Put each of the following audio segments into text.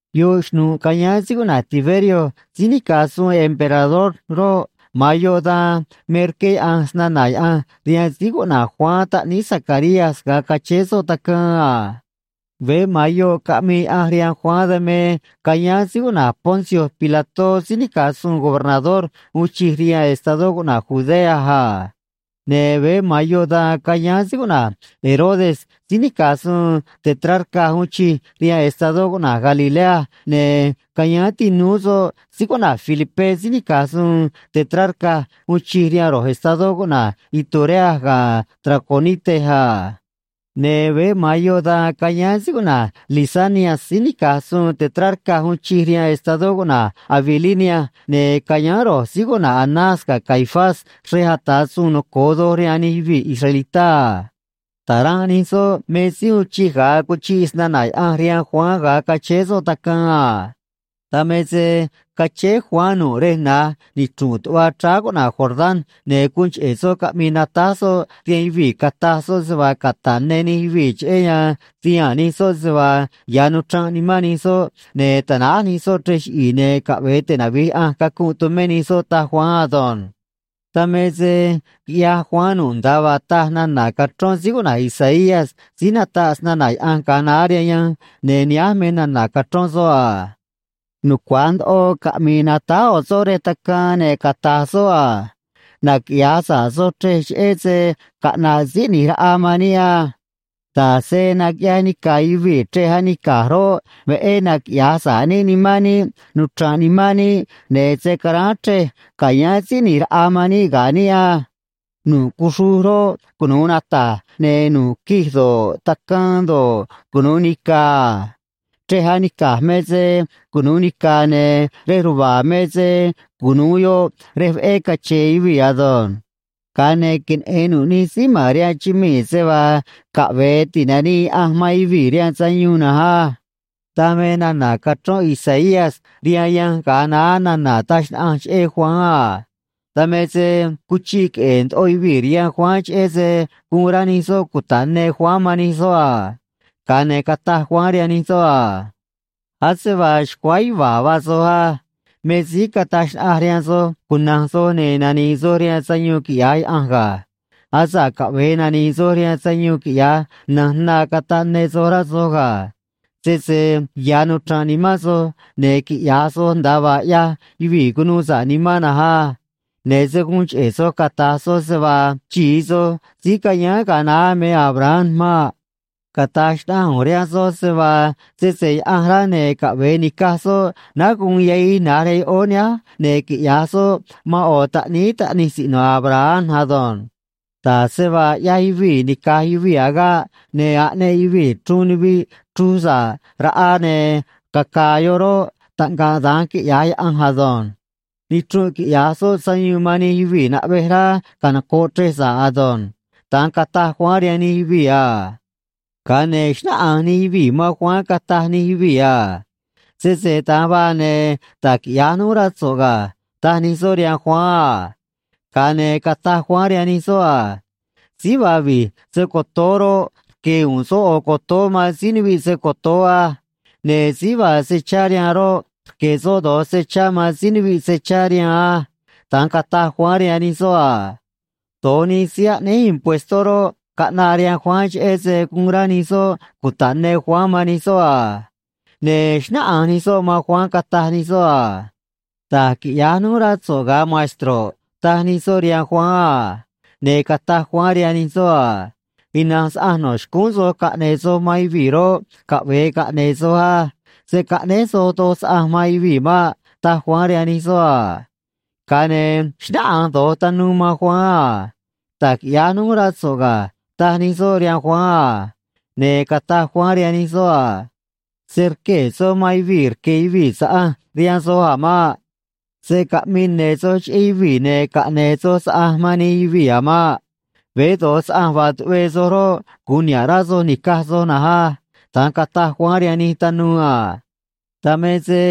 Yoꞌ xnu̱ꞌ cayáán síí cuꞌna̱j Tiberio síí nica̱j suun emperador roꞌ, ma̱an yoꞌ dan me rqué Yaꞌanj snana̱ Yaꞌanj rihaan síí cuꞌna̱j Juan taꞌníí Zacarías ga̱a cachéé soꞌ tacaan a. Veé ma̱an yoꞌ caꞌmii Yaꞌanj rihaan Juan, dan me cayáán síí cuꞌna̱j Poncio Pilató síí nica̱j suun gobernador uun chij rihaan estadó cuꞌna̱j Judea a. Ne̱ veé ma̱an yoꞌ dan cayáán síí cuꞌna̱j Herodes síí nica̱j suun tetrarca uun chij rihaan estadó cuꞌna̱j Galilea, ne̱ cayáán tinúú soꞌ síí cuꞌna̱j Felipé síí nica̱j suun tetrarca uun chij rihaan ro̱j estadó cuꞌna̱j Iturea ga̱ Traconite a. Ne̱ veé ma̱an yoꞌ dan cayáán síí cuꞌna̱j Lisanias síí nica̱j suun tetrarca uun chij rihaan estadó cuꞌna̱j Abilinia, ne̱ cayáán ro̱j síí cuꞌna̱j Anás ga̱ Caifás xrej ata̱ suun noco̱o doj rihaan nij yuvii̱ israelitá a. Ta̱ranꞌ nij soꞌ me síí uun chij ga̱a cuchiꞌ snana̱ Yaꞌanj rihaan Juan ga̱a cachéé soꞌ tacaan a. Dan me se cachéé Juan nu̱ꞌ rej na̱j nichru̱nꞌ tuꞌva chráá cuꞌna̱j Jordán, ne̱ guun cheꞌe̱ soꞌ caꞌmii natáj soꞌ rihaan yuvii̱, cataj soꞌ se vaa cata̱ꞌ ne nij yuvii̱ cheꞌé yan ti̱haa̱n nij soꞌ se vaa ya̱ nuchranꞌ nimán nij soꞌ ne̱ tanáj nij soꞌ chrej chiꞌi̱i̱, ne̱ caꞌve̱e tinavi̱j Yaꞌanj cacunꞌ tumé nij soꞌ, taj Juan ado̱nj. Dan me se quiꞌyaj Juan nu̱ꞌ nda̱a vaa taj nana̱ cachrón síí cuꞌna̱j Isaías síí nataꞌ snana̱ Yaꞌanj ga̱a naá rihaan yanj, ne̱ nihánj me nana̱ cachrón soꞌ a: Nucua̱j ndoꞌo caꞌmi̱i̱ natáj ꞌo̱ soꞌ rej tacaan, ne̱ cata̱j soꞌ a: “Naquiꞌya̱j sa̱ꞌ soj chrej cheꞌé se caꞌna̱ꞌ Síí ꞌNi̱j Raꞌa man níꞌ á. Da̱j se naquiꞌyaj nica̱ yuvii̱ chrej anica̱j roꞌ, veꞌé naquiꞌya̱j sa̱ꞌ níꞌ nimán níꞌ, nuchra̱nꞌ nimán níꞌ, ne̱ se̱ caráán chrej ca̱yáán Síí ꞌNi̱j Raꞌa man níꞌ ga̱ níꞌ á. Nu̱ꞌ cuxruj roꞌ, cunu̱u nata̱j, ne̱ nu̱ꞌ quij do̱ꞌ, tacaan do̱ꞌ, cunu̱u nica̱ a. Chrej anica̱j me se cunu̱u nica̱, ne̱ rej ruva̱a̱ me se cunu̱u yoꞌ rej veꞌé cache̱n yuvii̱ ado̱nj. Ga̱a ne̱ queneꞌe̱n nu̱ꞌ nij síí ma̱n rihaan chumii̱ se vaa caꞌve̱e ti̱nanii Yaꞌanj man yuvii̱ rihaan sayuun na̱nj á.” Dan me nana̱ cachrón Isaías rihaan yanj ga̱a naá nana̱ taj xnaꞌanj cheꞌé Juan a. Dan me se cuchiꞌ queꞌe̱e̱ ndoꞌo yuvii̱ rihaan Juan cheꞌé se guun rá nij soꞌ cuta̱ꞌ ne Juan man nij soꞌ a. Ga̱a ne̱ cataj Juan rihaan nij soꞌ a: ―Ase vaa xcuáá yuva̱a̱ vaa soj á. Me síí cataj xnaꞌanj rihaan soj cuna̱nj soj, ne̱ nani̱i̱ soj rihaan sayuun quiꞌya̱j Yaꞌanj ga̱. Asa̱ꞌ caꞌve̱e nani̱i̱ soj rihaan sayuun, quiꞌya̱j na̱nj na cata̱ꞌ ne soj, rá soj ga̱. Sese ya̱ nuchranꞌ nimán soj, ne̱ quiꞌya̱j soj nda̱a vaa ꞌyaj yuvii̱ cunuu sa̱ꞌ nimán na̱nj á. Ne̱ se̱ guun cheꞌe̱ soj cata̱j soj se vaa xi̱i soj síí cayáán ga̱a naá me Abraham maꞌ. Cata̱j xnaꞌanj ꞌu̱nj rihaan soj se vaa, sese Yaꞌanj rá, ne̱ caꞌve̱e ni̱caj soꞌ náá guun yahij na̱j rihaan yoꞌóó nihánj, ne̱ quiꞌya̱j soꞌ man ꞌo̱ taꞌníí taꞌnij siꞌno̱ Abraham ado̱nj. Da̱j se vaa ꞌyaj yuvii̱ nica̱j yuvii̱ agaꞌ ne̱ aꞌneꞌ yuvii̱ chruun nuviꞌ chruj sa̱ꞌ raꞌa ne̱ caca̱a̱ yoꞌ roꞌ, taꞌngaꞌ da̱nj quiꞌya̱j Yaꞌanj ado̱nj. Nichrunꞌ quiꞌya̱j soꞌ sayuun man nij yuvii̱ naꞌvej rá canoco̱ꞌ chrej sa̱ꞌ ado̱nj ―da̱nj cataj Juan rihaan nij yuvii̱ a. Ga̱a ne̱ xnáꞌanj nij yuvii̱ man Juan, cataj nij yuvii̱ a: ―Sese da̱nj vaa, ne̱ da̱j quiꞌya̱j núj, rá so̱ꞌ ga̱ ―taj nij soꞌ rihaan Juan a. Ga̱a ne̱ cataj Juan rihaan nij soꞌ a: ―Síí vaa vi̱j se‑co̱toó roꞌ, rque̱ u̱u̱n soꞌ ꞌo̱ cotoó man síí nuviꞌ se‑co̱toó á. Ne̱ síí vaa se chá rihaan roꞌ, rque̱ soꞌ do̱j se chá man síí nuviꞌ se chá rihaan á ―da̱nj cataj Juan rihaan nij soꞌ a. Do̱j nij síí aꞌnéj impuestó roꞌ, caꞌnaꞌ rihaan Juan cheꞌé se guun rá nij soꞌ cuta̱ꞌ ne Juan man nij soꞌ a. Ne̱ xnáꞌanj nij soꞌ man Juan, cataj nij soꞌ a: ―Da̱j quiꞌya̱j núj, rá so̱ꞌ, ga̱a maestro̱ꞌ ―taj nij soꞌ rihaan Juan a. Ne̱ cataj Juan rihaan nij soꞌ a: ―Ina̱nj saꞌanj no̱ xcúún soj caꞌne̱e̱ soj man yuvii̱ roꞌ, caꞌve̱e caꞌne̱e̱ soj á. Se̱ caꞌnéj soj doj saꞌanj man yuvii̱ maꞌ ―taj Juan rihaan nij soꞌ a. Ga̱a ne̱ xnáꞌanj do̱j tanuu man Juan a: ―Da̱j quiꞌya̱j núj, rá so̱ꞌ ga̱ ―taj nij soꞌ rihaan Juan a. Ne̱ cataj Juan rihaan nij soꞌ a: ―Se̱ rquee̱ soj man yuvii̱ rque̱ yuvii̱ saꞌanj rihaan soj a̱ maꞌ. Se̱ caꞌmii ne̱ soj cheꞌé yuvii̱ ne̱ caꞌne̱e̱ soj saꞌanj man nij yuvii̱ a̱ maꞌ. Veé do̱j saꞌanj vaa tuꞌvee soj roꞌ, gu̱un niha̱ꞌ rá soj ni̱caj soj na̱nj á ―da̱nj cataj Juan rihaan nij tanuu a. Dan me se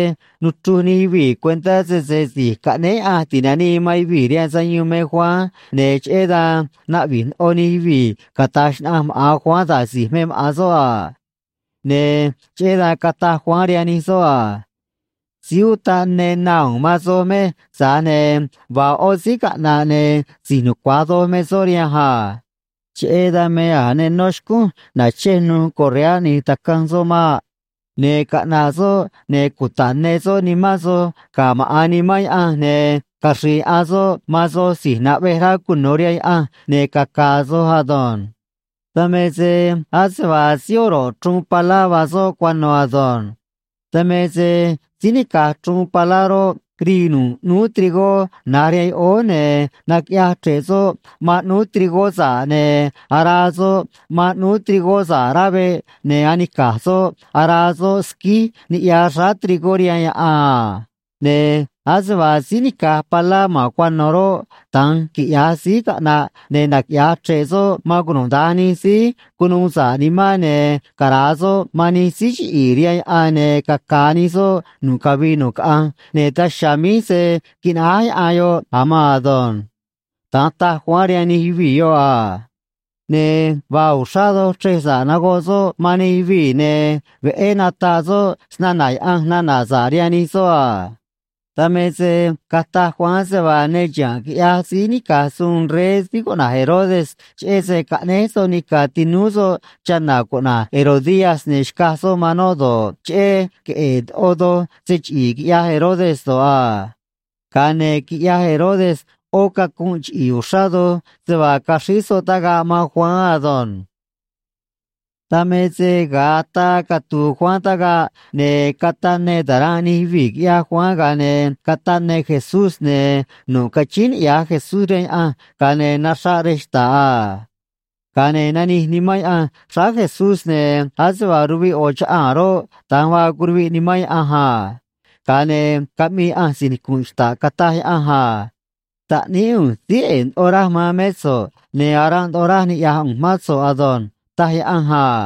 nuchruj nij yuvii̱ cuentá sese Si̱j Caꞌnéé Yaꞌanj Ti̱nanii man Yuvii̱ rihaan Sayuun me Juan, ne̱ cheꞌé dan naꞌvi̱j ndoꞌo nij yuvii̱ cata̱j xnaꞌanj maꞌa̱n Juan da̱j si̱j me maꞌa̱n soꞌ a. Ne̱ cheꞌé dan cataj Juan rihaan nij soꞌ a: ―Síí utaꞌ ne na u̱u̱n man soj mej, tza̱j ne̱ vaa ꞌó síí caꞌna̱ꞌ, ne̱ si̱j nucua̱j doj me soꞌ rihanj a. Cheꞌé dan me a̱j ne nó xcúnj na̱chej nuj correá ꞌni̱j tacanj soꞌ maꞌ. Ne̱ caꞌna̱ꞌ soꞌ, ne̱ cuta̱ꞌ ne soꞌ nimán soj ga̱ maꞌa̱n Nimán Yaꞌanj, ne̱ caxri̱i̱ yaꞌan soꞌ man soj si̱j naꞌvej rá cuno̱ rihaan Yaꞌanj, ne̱ caca̱a̱ soj ado̱nj. Dan me se ase vaa síí oro̱ꞌ chruun palá vaa soꞌ cuano̱ ado̱nj. Dan me se síí nica̱j chruun palá roꞌ, rii nu̱ꞌ ꞌnúú trigó na̱j rihaan yoꞌóó, ne̱ naquiꞌyaj chre̱ꞌ soꞌ man ꞌnúú trigó sa̱ꞌ, ne̱ araa soꞌ man ꞌnúú trigó sa̱ꞌ rá veꞌ, ne̱ anica̱j soꞌ araa soꞌ squíj niꞌya xráá trigó rihaan yaꞌan a. Ne̱ ase vaa síí nica̱j palá ma̱n cuano̱ roꞌ, da̱nj quiꞌya̱j síí caꞌna̱ꞌ, ne̱ naquiꞌya̱j chre̱ꞌ soꞌ man cunuda̱nj nij síí cunuu sa̱ꞌ nimán, ne̱ cara̱a soꞌ man nij síí chiꞌi̱i̱ rihaan yaꞌan, ne̱ caca̱a̱ nij soꞌ nu̱ꞌ cavii nu̱ꞌ caꞌanj, ne̱ daj chiha̱a̱ míj se̱ quinaꞌáj yaꞌan yoꞌ a̱ maan ado̱nj ―da̱nj taj Juan rihaan nij yuvii̱ yoꞌ a. Ne̱ vaa uxrá doj chrej sa̱ꞌ nagoꞌ soꞌ man nij yuvii̱, ne̱ veꞌé nataꞌ soꞌ snana̱ Yaꞌanj nana̱ sa̱ꞌ rihaan nij soꞌ a. Dan me se cataj Juan se vaa ne chiha̱nꞌ quiꞌyaj síí nica̱j suun rey síí cuꞌna̱j Herodes cheꞌé se caꞌnéj soꞌ nica̱ tinúú soꞌ chana̱ cuꞌna̱j Herodías ne̱ xcaj soꞌ man noꞌ do̱ꞌ, cheꞌé queꞌe̱e̱ ndoꞌo doj se chiꞌi̱i̱ quiꞌyaj Herodes do̱ꞌ a. Ga̱a ne̱ quiꞌyaj Herodes ꞌó cacunꞌ chiꞌi̱i̱ uxrá doj se vaa caxríj soꞌ tagaꞌ man Juan ado̱nj. Dan me se ga̱a ataa catu̱u̱ Juan tagaꞌ, ne̱ cataꞌ ne ta̱ranꞌ nij yuvii̱, quiꞌyaj Juan, ga̱a ne̱ cataꞌ ne Jesús, ne̱ nu̱ꞌ cachíín niꞌya̱j Jesús rihaan Yaꞌanj, ga̱a ne̱ naxraꞌ rej xta̱ꞌ a. Ga̱a ne̱ nanij Nimán Yaꞌanj xráá Jesús, ne̱ ase vaa ruviꞌ ꞌo̱ chaꞌaa̱n roꞌ, da̱nj vaa curuviꞌ Nimán Yaꞌanj a. Ga̱a ne̱ caꞌmii Yaꞌanj si̱j nicu̱nꞌ xta̱ꞌ, cataj Yaꞌanj a: ―Taꞌníí ꞌu̱nj síí ꞌe̱e̱ ndoꞌo raj man mé so̱ꞌ, ne̱ aranꞌ ndoꞌo raj niꞌya̱j ꞌu̱nj mán so̱ꞌ ado̱nj ―taj Yaꞌanj a.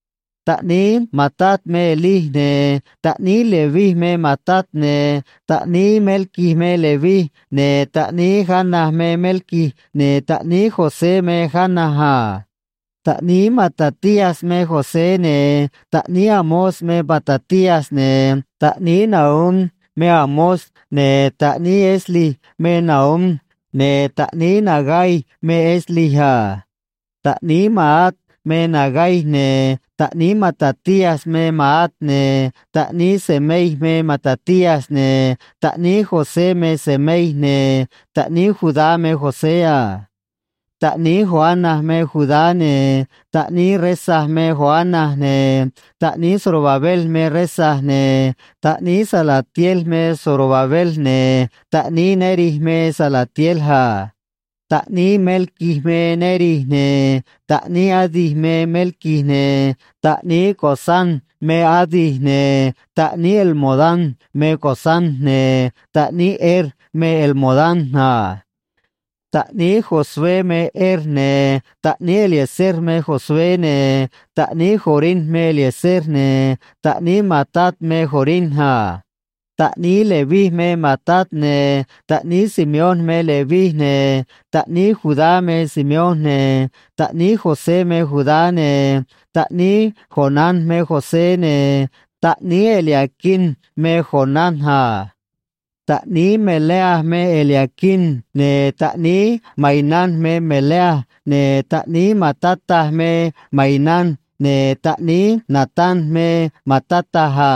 Taꞌníí Matat me Elí, ne̱ taꞌníí Leví me Matat, ne̱ taꞌníí Melqui me Leví, ne̱ taꞌníí Jana me Melqui, ne̱ taꞌníí José me Jana a. Taꞌníí Matatías me José, ne̱ taꞌníí Amós me Matatías, ne̱ taꞌníí Nahum me Amós, ne̱ taꞌníí Esli me Nahum, ne̱ taꞌníí Nagai me Esli a. Taꞌníí Maat me Nagai, ne̱ taꞌníí Matatías me Maat, ne̱ taꞌníí Semei me Matatías, ne̱ taꞌníí José me Semei, ne̱ taꞌníí Judá me José a. Taꞌníí Joana me Judá, ne̱ taꞌníí Resa me Joana, ne̱ taꞌníí Zorobabel me Resa, ne̱ taꞌníí Salatiel me Zorobabel, ne̱ taꞌníí Neri me Salatiel a. Taꞌníí Melqui me Neri, ne̱ taꞌníí Adi me Melqui, ne̱ taꞌníí Cosam me Adi, ne̱ taꞌníí Elmodam me Cosam, ne̱ taꞌníí Er me Elmodam a. Taꞌníí Josué me Er, ne̱ taꞌníí Eliezer me Josué, ne̱ taꞌníí Jorim me Eliezer, ne̱ taꞌníí Matat me Jorim a. Taꞌníí Leví me Matat, ne̱ taꞌníí Simeón me Leví, ne̱ taꞌníí Judá me Simeón, ne̱ taꞌníí José me Judá, ne̱ taꞌníí Jonán me José, ne̱ taꞌníí Eliaquim me Jonán a. Taꞌníí Melea me Eliaquim, ne̱ taꞌníí Mainán me Melea, ne̱ taꞌníí Matata me Mainán, ne̱ taꞌníí Natán me Matata a.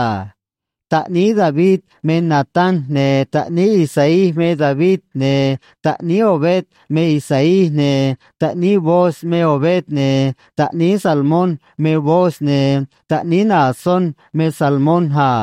Taꞌníí David me Natán, ne̱ taꞌníí Isaí me David, ne̱ taꞌníí Obed me Isaí, ne̱ taꞌníí Booz me Obed, ne̱ taꞌníí Salmón me Booz, ne̱ taꞌníí Naasón me Salmón a.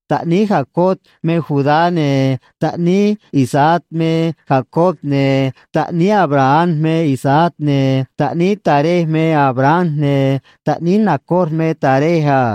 Taꞌníí Jacob me Judá, ne̱ taꞌníí Isaac me Jacob, ne̱ taꞌníí Abraham me Isaac, ne̱ taꞌníí Taré me Abraham, ne̱ taꞌníí Nacor me Taré a.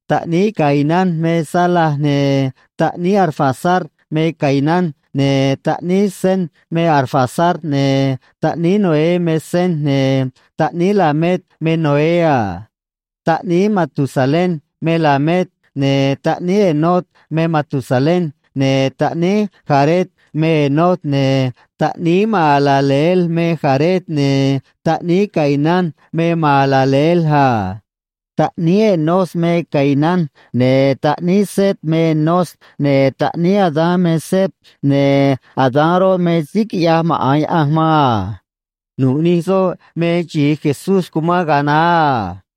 Taꞌníí Cainán me Sala, ne̱ taꞌníí Arfaxad me Cainán, ne̱ taꞌníí Sem me Arfaxad, ne̱ taꞌníí Noé me Sem, ne̱ taꞌníí Lamec me Noé a. Taꞌníí Matusalén me Lamec, ne̱ taꞌníí Enoc me Matusalén, ne̱ taꞌníí Jared me Enoc, ne̱ taꞌníí Mahalaleel me Jared, ne̱ taꞌníí Cainán me Mahalaleel a. Taꞌníí Enós me Cainán, ne̱ taꞌníí Set me Enós, ne̱ taꞌníí Adán me Set, ne̱ Adán roꞌ, me síí quiꞌyaj maꞌa̱n Yaꞌanj man a. Nu̱ꞌ nij soꞌ me xi̱i Jesús cumán ga̱a naá a.